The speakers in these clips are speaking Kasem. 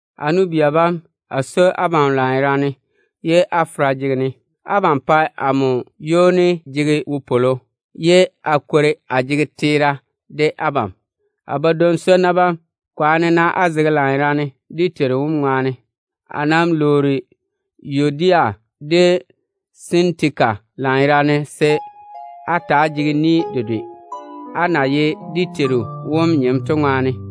A nu-bia bam, a swoi abam lanyerane ye á fera jege-ne. Abam pae amo ywoni jege wopwolo, ye a kwori a jege teera de abam. A badwoŋ-swonnu bam, kwaane-na á fɔge á zege lanyerane dé Teiru wom ŋwaane. A nam lwoori Yuodia de Sintika lanyerane se á ta‑á jege boboŋe dedwe, á maama na ye dé Teiru wom nyem to ŋwaane.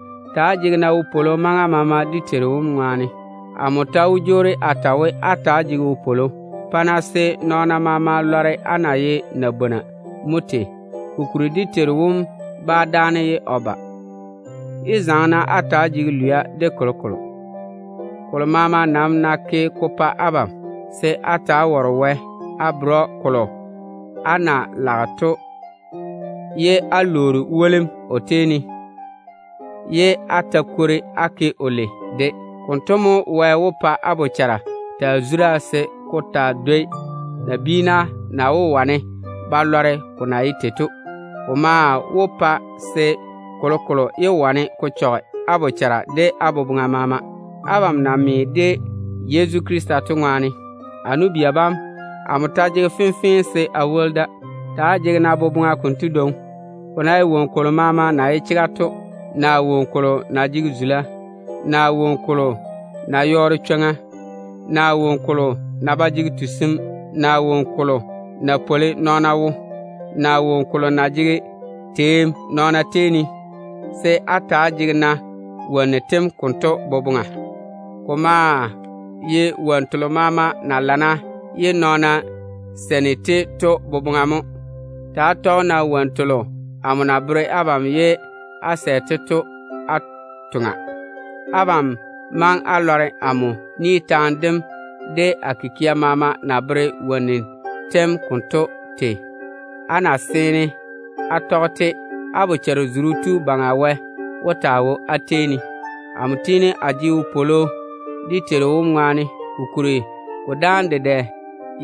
Ta‑á jege-na wopwolo maŋa maama dé Teiru wom ŋwaane. Amo ta wó jwoori a ta we, á ta‑á jege wopwolo. Pa-na se nɔɔna maama lɔre á na zuri á yera mo tei. Kokuri dé Teiru wom bá dáane ye o ba. Yé zaŋe-na á ta‑á jege lwia de kolokolo. Kolo maama nam ná ke ko pa abam, se á ta‑á ware Wɛ á bere‑o kolo á na lage to, ye á lwoori wolim o tei ne, ye á ta kwori á ke‑o lei. Konto mo Wɛ wó pa á bochara taa zura se ko taa dwoi nabiina na wó wane ba lɔre ko na ye tei to, se kolokolo yé wane ko chɔge á bochara de á boboŋa maama, á na me de Yezu Krista to ŋwaane. A nu-bia bam, amo ta jege fenfee se a ta a woli da. Ta‑á jege-na boboŋa konto dwoŋi: ko ná ye woŋo kolo maama na ye chega to, de woŋo kolo na jege zula, de woŋo kolo na yɔɔre chwoŋa, de woŋo kolo na ba jege tusim, de woŋo kolo na pwoli nɔɔna wo, de woŋo kolo na jege teem nɔɔna tei ne, se á ta‑á jege-na wonnu tem konto boboŋa. Ko maa ye wonnu telo maama na lana ye nɔɔna seini-te to boboŋa mo. Ta‑á toŋe-na á tɔge wonnu telo amo na bere abam ye á sɛ-te to. Abam maŋe á lɔre amo ni taane dem de a kikia maama na bere wonnu tem konto tei. Á ná seene á tɔge-te, bochare-zuru tu Baŋa Wɛ wó taa wo á tei ne. Amo tiini a jege wopwolo dé Teiru wom ŋwaane, kokuri ko dáane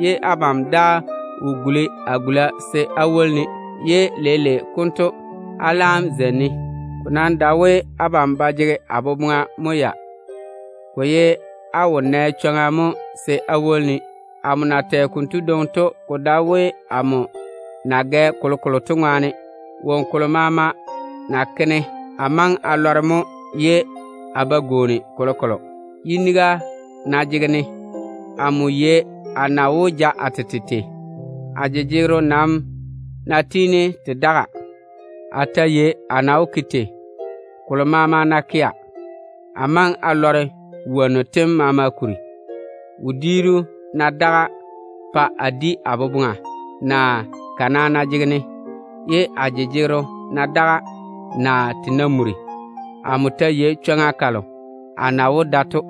ye abam daa wo guli a gula se á woli-ne, ye leile konto á laam jwoori á zeini-ne. Ko nam dae we abam ba jege a boboŋa mo ya, ko ye á wo nɛ chwoŋa mo se á woli-ne. Amo na tɛ konto dwoŋi to, ko dae we amo na gɛ kolokolo to ŋwaane mo. Woŋo kolo maama ná ke-ne, a maŋe a lɔre mo ye a ba gwooni kolokolo. Yiniga ná jege-ne, amo yei a na wó ja a tete tei. A jeŋa nam ná jega, a ta yei a na wó ke tei. Kolo maama ná yi-ne, a maŋe a yei ko kuri. Wodiiru ná daga pa a di a boboŋa, naa kana ná jege-ne, ye a jejegero ná daga, naa te ná muri, amo ta yei chwoŋa kalo a na wó da to.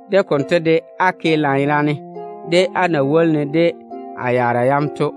De konto de, á ke lanyerane de á na woli-ne de a yaara yam to.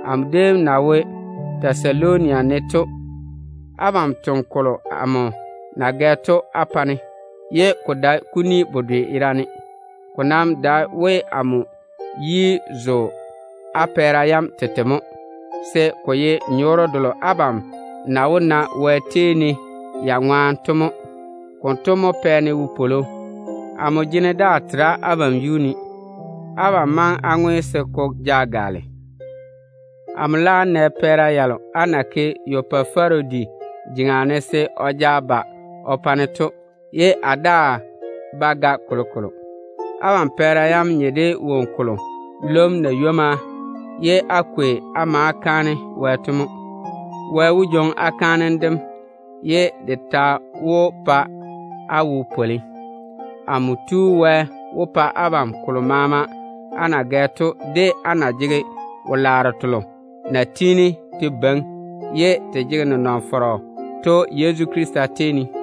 Amo déem na wo Tɛsaloni ne to, abam toŋe kolo amo na gɛ to á pa-ne, ye ko dae kuni bedwe yerane. Ko nam dae we amo yi zo á pɛɛra yam tete mo, se ko ye nyɔɔre delo abam na wó na Wɛ tei ne ya ŋwaane to mo. Konto mo pɛ-ne wopwolo. Amo jene daa tera abam yuu ne. Abam maŋe á ke se ko gaale á pa-ne. Amo laam nɛ pɛɛra yalo á na ke Epafarodi jeŋa ne se o ja ba o pa-ne to, ye a daa bá ga kolokolo. Abam pɛɛra yam nye de woŋo kolo lwom na ywomma ye á kwei á ma kaane Wɛ to mo. Wɛ wó jwoŋi á kaanem dem ye de ta wó pa o wo pwoli. Amo Tu Wɛ wó pa abam kolo maama á na gɛ to, de o na jege wo-laaro telo na tiini te beiŋi ye te jege nenɔŋ-fɔrɔ Yezu Krista tei ne to.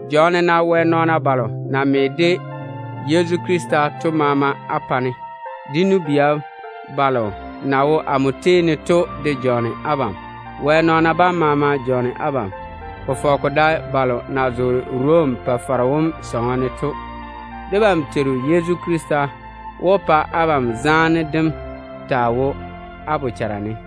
Jɔɔne-na Wɛ nɔɔna balo na me de Yezu Krista to maama á pa-ne. Dé nu-bia balo na wo amo tei ne to de jɔɔne abam. Wɛ nɔɔna bam maama jɔɔne abam, ko fɔge ko dae balo na zoore Rom Pa-faro wom sɔŋɔ ne to. Debam Teiru Yezu Krista wó pa o zaane dem taa wo á bochara ne.